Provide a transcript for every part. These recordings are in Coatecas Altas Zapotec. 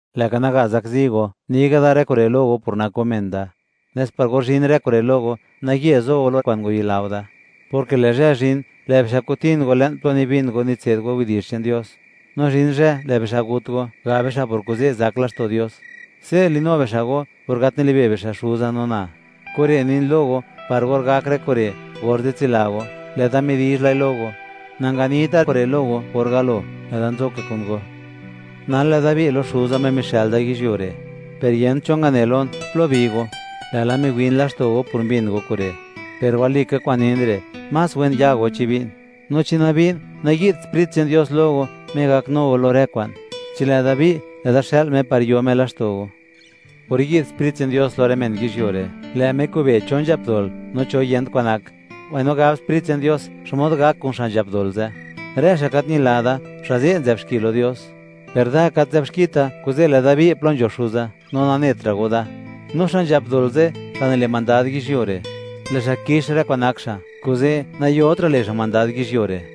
’Lë'ga naga zakzi go, ni ga' da rë kure' lo go por nak go men da, nes par or zhin rë kure' lo go, naye zo go lo kwa'n ngwayila go da, porke lë' zhë zhin, lë' bixa' ko'tin go le'n plo nibin go nitse'd go widi'zh che'n Dios; no zhin zhë, lë' bixa' gut go, gab bixa' por kuze' zak laxto' Dios. Se' le'nu bixa' go, por gat nilibe' bixa' Xuza no na. Kure' nin lo go, par or gak rë kure', orze' tsila go, lë'da ni lai lo go. ’Nanganita kure' lo go or galo, lë'da nzo ka kun go; nal, lë'da bi' la lo Xuza, Me mixë'l da yizhyuo re'; per yent cho ngane lon: “¿Plo bi go?”, lë'la miwin laxto' go por mbin go kure'. Per walika kwa'n nin re'; más wen ya go chi bi'n. No chi nabi'n, nayi'dt Sprit che'n Dios lo go, Me gaknu go lo rë kwa'n. Chi lë'da bi', lë'da xël Me par yo Me laxto' go. Or yi'd Sprit che'n Dios lo rë men yizhyuo re', lë' Me kobe' (wi') cho nzhap dol, no cho yent kwan nak, mbaino gab Sprit che'n Dios xmod gak kun xa' nzhap dol ze'. Rë xa' gat ñila da, xa' ze' nzë'b xki lo Dios; per da gat nzë'b xkita, kuze' lë'da bi' plo nzho Xuza, no nanetra' go da. No xa' nzhap dol ze', xa' nile' mandad yizhyuo re', lë' xa' kix rë kwa'n nak xa', kuze' nayotra' le' xa' mandad yizhyuo re'.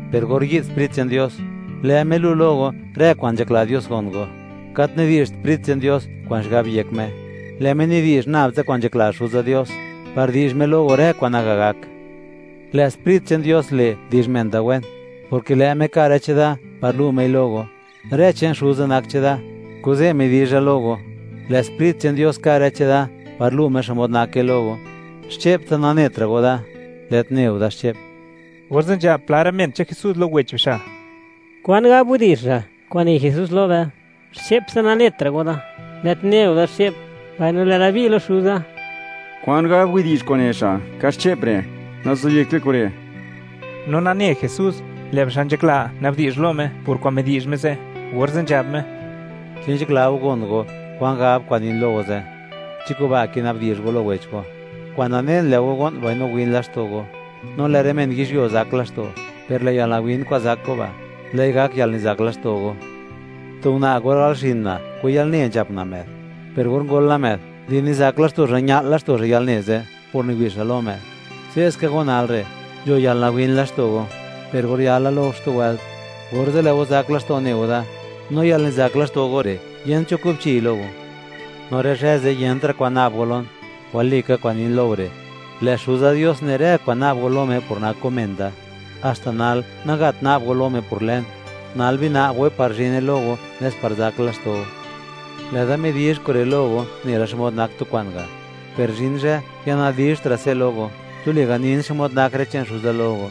per or yi'd Sprit che'n Dios, lë' Me lu' lo go, rë kwa'n nzhakla Dios gon go. Gat nidi'zht Sprit che'n Dios kwa'n xigab yek Me, lë' Me nidi'zh nab tsa kwa'n nzhakla Xuza Dios, par di'zh Me lo go rë kwa'n naga gak. Lë' Sprit che'n Dios le', di'zh men da wen, porke lë' Me ka' rë cheda par lu' Mei lo go. Rë che'n Xuza nak cheda; kuze' midi'zha lo go, lë' Sprit che'n Dios ka' rë cheda par lu' Me xmod nake lo go. Xche'ptsa nanetra' go da, lë't ne go da xche'p. Orze' nzhab pla rë men che'n Jesús lo wech bixa': ―¿Kwan gab widi'zh re' kwa'n ne Jesús lo be: “Xche'ptsa nanetra' go da, lë't ne go da xche'p”, mbaino, “Lë'da bi' lo Xuza”? ¿Kwan gab widi'zh kwa'n ne xa': “Kaxche'p”, re'? Nazobyekt be kure'. No nane Jesús, lë' bixa' nzhakla na'bdi'zh lo Me por kwa'n midi'zh Me ze', orze' nzhab Me: ―¿Chi nzhakla go gon go kwan gab kwa'n nin lo go ze'? ¿Chi kuba' kina'bdi'zh go lo wech go? Kwa'n nanen, lë' go go'n, no win laxto' go, no lë' rë men yizhyuo zak laxto'; per lë' yalnawin kwa'n zak go ba', lë'i gak yalnizak laxto' go. Tu una' or gal xin una', kun yalne nzhap una' më'd; per or ngol la më'd, di nizak laxto' xa' ña'l laxto' xa' yalne ze' por niwi' xa' lo më'd. Se' ska go nal re', nzho yalnawin laxto' go, per or yala lo go xtu wëlt, orze' lë' go zak laxto' ne go da, no yalnizak laxto' go re', yent cho kubchiy lo go. No rë zhë ze', yentra' kwan na'b go lon. Walika kwa'n nin lo go re', lë' Xuza Dios ne' rë kwa'n na'b go lo Me, por nak go men da. Haxta nal, nagat na'b go lo Me por lën; nal bina'b goi par zhine lo go, nes par zak laxto' go. ’Lë'da midi'zh kure' lo go nela xmod nak tu kwa'n ga', per zhin zhë ya nadizhtra' se' lo go, tuli ganin xmod nak rë che'n Xuza lo go.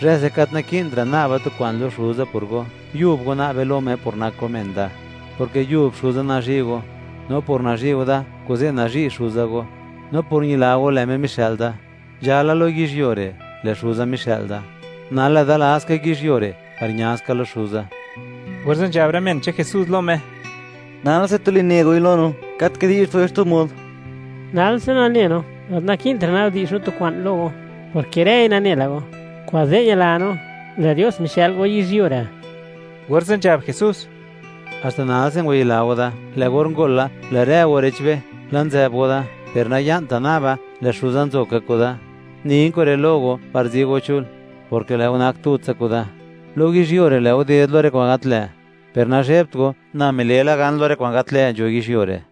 Zhë ze' gat naki'ntra' na'ba tu kwa'n lo Xuza por go; yub go na'be lo Me por nak go men da, porke yub Xuza nazhi' go, no por nazhi' go da, kuze' nazhi' Xuza go, no por ñila go, lë' Me mixë'l da. Nzhala lo yizhyuo re', lë' Xuza mixë'l da; nal lë'da la ska yizhyuo re' par ña ska lo Xuza. Orze' nzhab rë men che'n Jesús lo Me: ―Nalse tuli ne goi lo no, gat kidi'zht goi xtu mod; nalse nane no, gat naki'ntra' na'bdi'zh no tu kwa'n lo go, porke rëi nane la go; kuze' ñila no, lë' Dios mixë'l go yizhyuo re'. Orze' nzhab Jesús: ―¿Haxta nalse ngwayila go da? Lë' or ngol la, lë' rë go re'chbe, la' nzë'b go da; per naya'nta' naba, lë' Xuza nzo ka kuda. Nin kure' lo go par zi go chul, porke lë' go nak tutsa kuda. Lo yizhyuo re', lë' go ded lo rë kwa'n gat lë', per nazhebt go, na mile' la gan lo rë kwa'n gat lë' nzho yizhyuo re'.